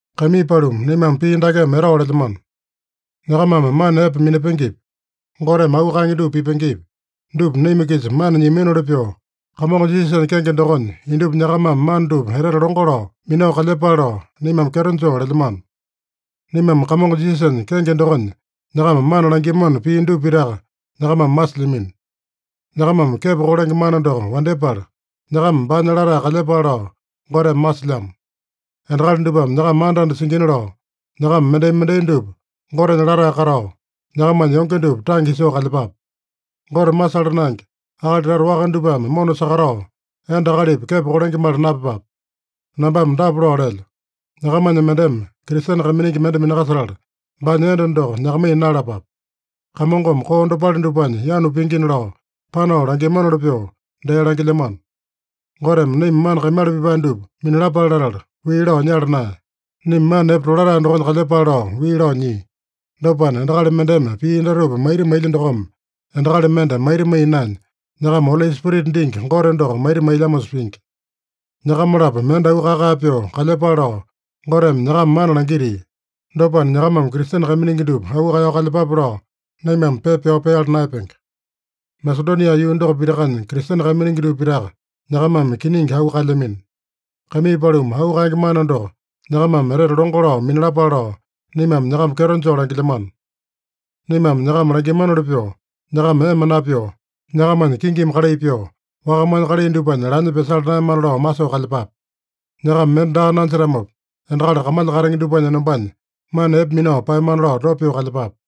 Kaimii paluma, naimame pii dakeme etao lelyamano: Nyakamame mana epe minapengepi, Goteme auu kaenge dupa pipengepi, dupa naima-kisa mana nyiaminoli pyoo, Kamongo Jisasanya kenge dokonya indupa nyakamame mana dupa etete longo lao minao kalyepale lao, naimame kyeto joo lelyamano. Naimame Kamongo Jisasanya kenge dokonya nyakama mana langiamano pii dupa pitaka nyakamame masilyamino. Nyakamame kepo kolenge mana doko wandyepala, nyakama baanya latae kalyepale lao Goteme masilyamo. Endakali dupame nyakama anda-anda singina lao, nyakama mendai-mendai dupa Gotenya latae katao, nyakamanya yonge dupa tange isoo kalyepape. Gote masala naenge, akali tata waka dupame mona sakatao, enda akalipi kepo kolengemali napyepape. Nambame dapa lao lelyo: Nyakamanya mendeme Kristene kaiminingi mende minakasetala, baanya enda doko nyakamaiya naeyalapape. Kamongome koo dopale dupanya yanu pingina lao, panao langiamanoli pyoo, dee langilyamano. Goteme naima mana kaimala pipae dupa minalapale latala, wii lao nyala naeya. Naima mana epe tolatae dokonya kalyepale lao wii lao nyia. Dopana, endakali mendeme pii datupa maita mailya dokome, endakali mende maita maiya naenya, nyakama Oli Spirita dingi Gote doko maita mailyamosa pingi. Nyakama-lapo mende auu kae-kae pyoo kalyepale lao, Goteme nyakama mana langitia. Dopana, nyakamame Kristene kaiminingi dupa auu kaeyao kalyepape lao, naimame pepa pyao peala naeyapenge. Masedonia yuu doko pitakanya Kristene kaiminingi dupa pitaka nyakamame kiningi auu kaelyamino. Kaimii paluma, auu kaenge mana doko nyakamame etete longo lao minalapale lao, naimame nyakama kyeto joo langilyamano. Naimame nyakama langiamanoli pyoo, nyakama ema napyoo, nyakamanya kingimi kalai pyoo, wakamanya kalai dupanya lanya pyasala naeyamana lao masoo kalyepape. Nyakama mende daa nanjetamopa, endakali kamalya katenge dupanya enombanya mana epe minao paeyamana lao dopa pyoo kalyepape.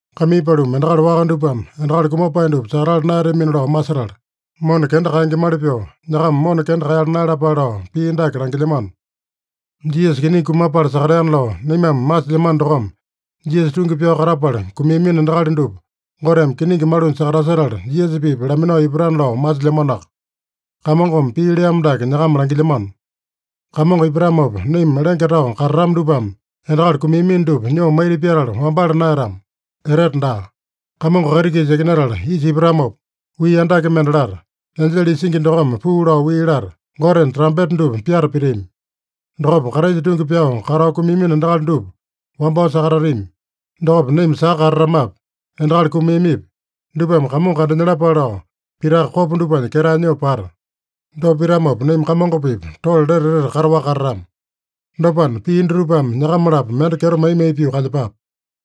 Kaimii paluma, endakali waka dupame endakali kumapae dupa sakatala naeyatamina lao masetala, mona kenda kaengemali pyoo, nyakama mona kenda kaeyala naeyalapale lao pii dake langilyamano: Jisasa kiningi kumapala sakateana lao naimame masilyamano dokome, Jisasa tungi pyao katapala kumiamino endakali dupa, Goteme kiningi malunya sakatasetala, Jisasa-pipa laminao ipatana lao masilyamanoaka. Kamongome pii leamo dake nyakama langilyamano: Kamongo ipatamopa naima lenge tao katatama dupame endakali kumiamino dupa nyoo maita pyatala wambala naeyatama, etete daa. Kamongo kaiti-kisa yakinatala isa ipatamopa, wii andake mende lata, enjele isingi dokome puu lao wii lata, Gotenya trampeta dupa pyata pitami. Dokopa Kraisa tungi pyao katao kumiamino endakali dupa wambao sakatatami. Dokopa naima saka katatamapi, endakali kumiamipi, dupame Kamongo kandanyalapale lao, pitaka kopa dupanya ketae nyoo pata. Dopa pitamopa, naima Kamongo-pipa tole lete etete kataowaka katatama. Dopana, pii dutupame nyakama-lapo mende kyeto mai-mai pyoo kalyepape.